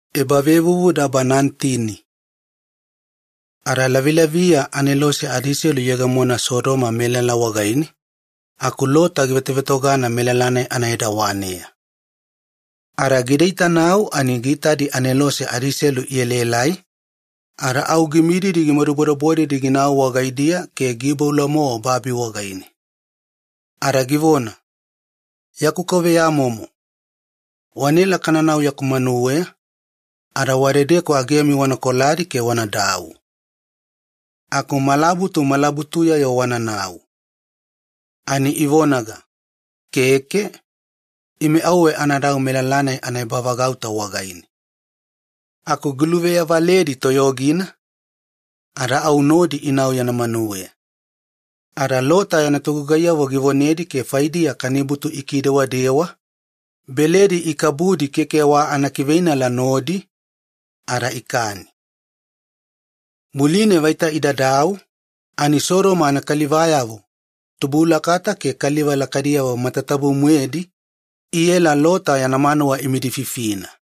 Sodoma anakalivamomo ikoyona. Ada lavilaviya anelose adiselu iyegemona Sodoma melala wagaine, aku Lota givetovetogana melala-nai anaedawaneya, ada gidaitanau ani giitadi anelose adiselu ielaelai, ada au gimididi gimadubodebodedi ginau wagaidiya ke giiboula-mowa babi wagaine ke givemoimoina. Ada givona, “Yaku kauveyamomo, wanaela kananau yaku manuweya ada wadedeku agemi wana koladi ke wanadau. Aku malabutu malabutuya-yo wananau.” Ani ivonaga, “Keke. Ime auwe anadau ebavagauta wagaine.” Aku giluveyavaledi toyogi-vagaina ada au nodi inau yana manuweya. Ada Lota yana togugaiyavo givonedi ke faidiya kanibutu ikidewadewa, beledi ikabudi keke wa anakiveinala nodi, ada ikani. Muline vaita idadau ani Sodoma anakalivayavo, tubulakata ke kaliva lakaidiyavo matatabu-moedi, iela Lota yana manuwa imidififina.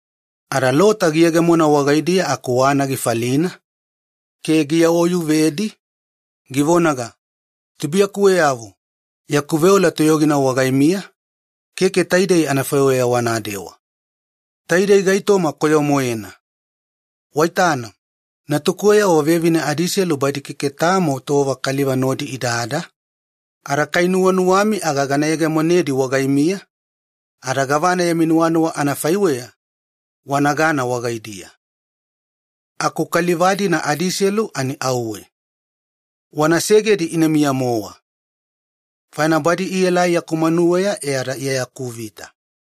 Ada Lota giyegemona wagaidiya aku wana gifalina ke givonedi, “Tubuiyakuweyavo, yaku veola toyogina wagaimiya, keke taidei anafaiweya wanadewa. Taidei gaitoma koyo-moena! Waitana, natukuweyavo vevine adiselu badi keke tamo tova kaliva nodi idada, ada kai nuwanuwami aga gana abidi gana yegemonedi wagaimiya ada gavana yami nuwanuwa anafaiweya wanagana wagaidiya. Aku kaliva adiselu auwe wana segedi ina miya-mowa. Faina badi ielai yaku manuweya iya akuvita, ada keke kadu gavana wanagai wagaidiya.”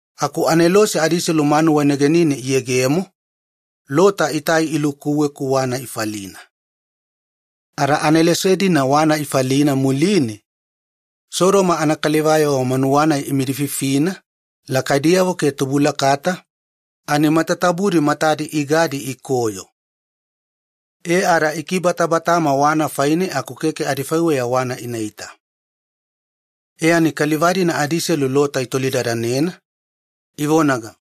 Aku anelose adiselu manuwa negenine iyegemo, Lota itai ilukuwe-ku wana ifalina. Ada anelose-dina wana ifalina muline, Sodoma anakalivayavo manuwa-nai imidififina lakaidiyavo ke tubulakata ani matatabudi matadi igadi ikoyo ada itutugana ada ibalalava aku keke adifaiweya wana inaita. Ada kaliva-dina adiselu Lota itolidadanena, ivonaga,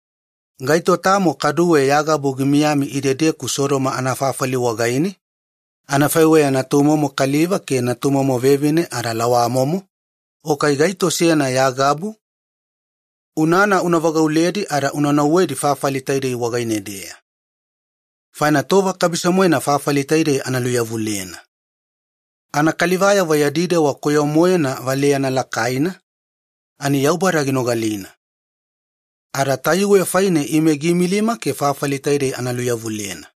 “Gaito tamo kaduwe ya gabu gimiyami idedeku Sodoma anafafali wagaine, anafaiweya natumomo kaliva ke natumomo vevine ada lawamomo o kai gaito seyana ya gabu? Unana una vagauledi ada wanaota fafali taidei wagaine-deya. Faina tova kabiso-moena fafali taidei ana luveyawaliyena. Yadi dewa koyo-moena Yaubada matane, ada tayuwe faine ime giimilima fafali taidei ana luveyawaliyena.”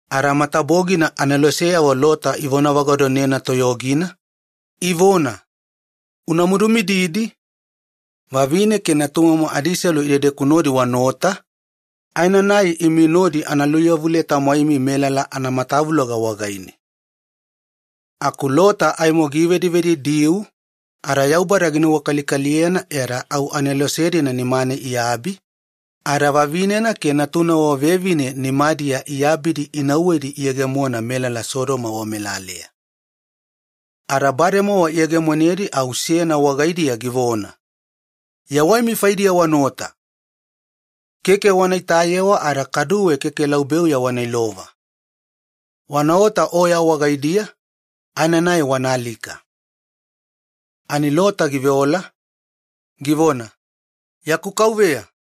Ada matabogina aneloseyavo Lota iluimimilina ivona, “Una madumididi! Vavine ke natumomo adiselu idedeku nodi wanaota aenanai o nodi ana luveyawaliye-tamwaini, tova-nai melala anamatavuloga wagaine.” Aku Lota aimo givedivedidiu, ada Yaubada ginuwakalikaliyena faine au anelose-dina nimane iabi ada vavinena ke natunavo vevine nimadiya iabidi inauwedi iyegemona melala Sodoma wamelaleya. Ada bademowa iyegemonedi au seyana wagaidiya givona, “Yawaimi faidiya wanaota! Keke wana itayewa ada kaduwe keke laubeuya wana ilova. Wanaota oya wagaidiya aenanai wanaalika.” Ani Lota giveola, givona, “Keke, yaku kauveya!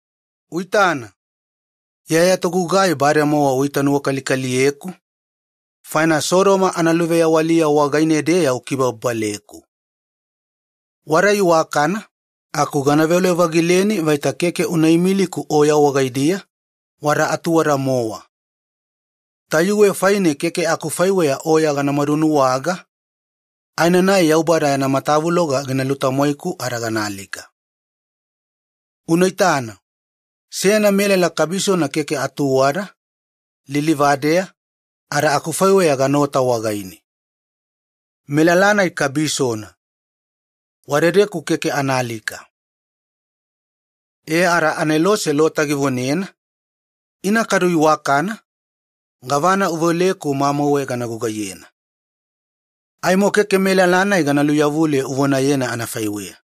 Uitana, iya ya togugai bademowa uitanuwakalikaliyeku, faina Sodoma analuveyawaliya wagaine-deya ukibababaleku. Wada iwakana, aku gana veole-vagileni, vaita keke una imiliku oya wagaidiya, wada atuwada-mowa. Tayuwe faina keke akufaiweya oya ganamadu nuwaga aenanai Yaubada yana matavuloga gina lutamwaiku ada ganaalika. Unaitana, seyana melala kabisona keke atuwada, lilivadeya, ada akufaiweya ganaota wagaine. Melala-nai kabisona. Wadadeku keke anaalika.” E ada anelose Lota givonena, “Ina kadu iwakana, gavana uveoleku mamauwe gana gugaiyena. Aimo keke melala-nai gana luveyawaliye uvoneyena anafaiweya.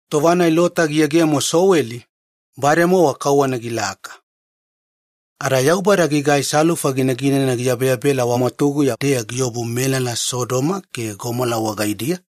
Tova-nai Lota giyegemo Soweli, bademowa kauwana gilaka. Ada Yaubada gigai fwayafwaya ginaginana giyabeyabela wagabameya-deya giobu anafaiweya wei melala Sodoma ke Gomola wagaidiya.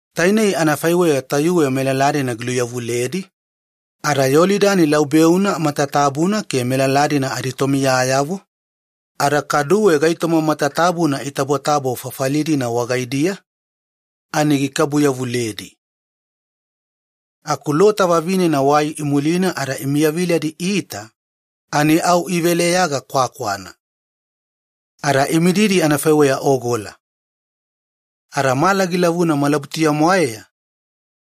Tainei anafaiweya tayuwe melala-dina giluveyawaliyedi, ada Iyolidani laubeuna matatabuna ke melala-dina aditomiyayavo ada kaduwe gaitoma matatabuna itabotabo fafali-dina wagaidiya ani gikabuyavuledi. Aku Lota vavinena waimulina ada imiyaviladi iita ani au iveleyaga kwakwana ada imididi anafaiweya ogola. Ada mala gilavuna malabutuya-mwaeya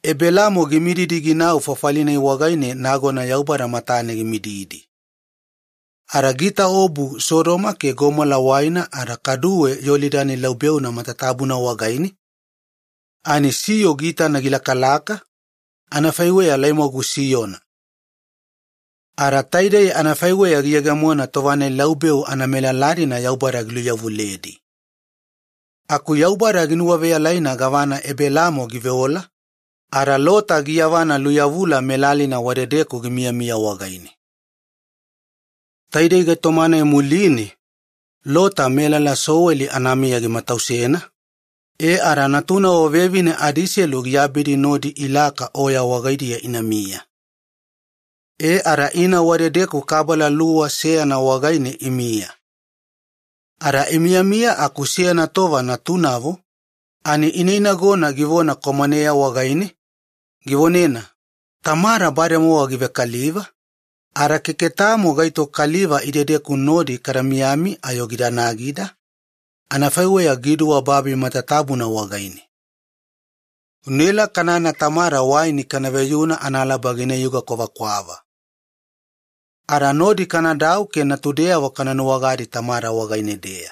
Ebelaamo gimididi ginau fafali-nai wagaine nagona Yaubada matane gimididi. Ada giitaobu Sodoma ke Gomola waina ada kaduwe Iyolidani laubeuna matatabuna wagaine ani siyo giitana gilakalaka, anafaiweya laimwagu siyona. Ada taidei anafaiweya giyegemona tova-nai laubeu anamelala-dina Yaubada giluveyawaliyedi. Aku Yaubada ginuwaveyalaina gavana Ebelaamo giveola, ada Lota giyavana luveyaweliya melalina wadedeku gimiyamiya wagaine. Lota ada natunavo vevine. Taidei gaitoma-nai muline, Lota melala Soweli anamiya gimatausena e ada natunavo vevine adiselu giabidi nodi ilaka oya wagaidiya inamiya. E ada ina wadedeku kabala luwa seyana wagaine imiya. Ada imiyamiya aku seyana tova natunavo ani ineinagona ani kwamaneya givonena, “Tamada bademowa givekaliva, ada keke tamo gaito kaliva idedeku nodi kada miyami ayo gida nagida, anafaiweya giduwa babi matatabuna wagaine. Unaela kanana tamada waini kana veyuna analaba ginayuga kwavakwava ada nodi kanadau ke natudeyavo kana nuwagadi tamada wagaine-deya,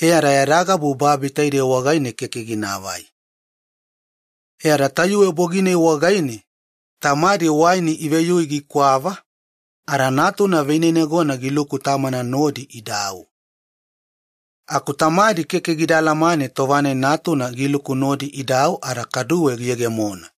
e ada yada gabu babi taidei wagaine keke ginaavai.” E ada tayuwe bogi-nai wagaine tamadi waini iveyui gikwava ada natuna vineinagona giluku tamana nodi idau. Aku tamadi keke gida alamane tova-nai natuna giluku nodi idau ada kaduwe giyegemona.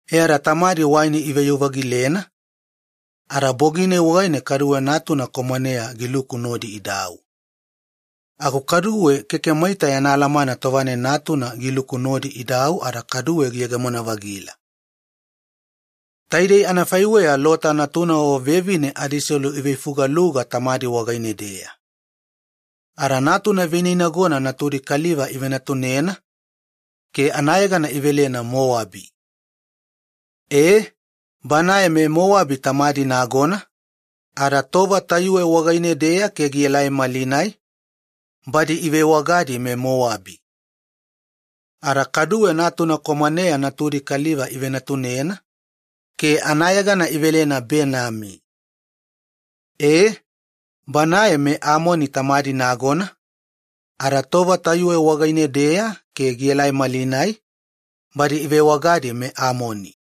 E ada tamadi waini iveyu-vagilena, ada bogi-nai wagaine kaduwe natuna kwamaneya giluku nodi idau. Aku kaduwe keke maita yana alamana tova-nai natuna giluku nodi idau ada kaduwe giyegemona-vagila. Taidei anafaiweya Lota natunavo vevine adiselu iveifugaluga tamadi wagaine-deya. Ada natuna vineinagona natudi kaliva ivenatunena, ke anayegana idouwena Mowabi. E, banae meMowabi tamadi nagona, ada malinai badi ivewagadi meMowabi. Ada kaduwe natuna kwamaneya natudi kaliva ivenatunena, ke anayegana idouwena Benami. E, banae meAmoni tamadi nagona, ada malinai badi ivewagadi meAmoni.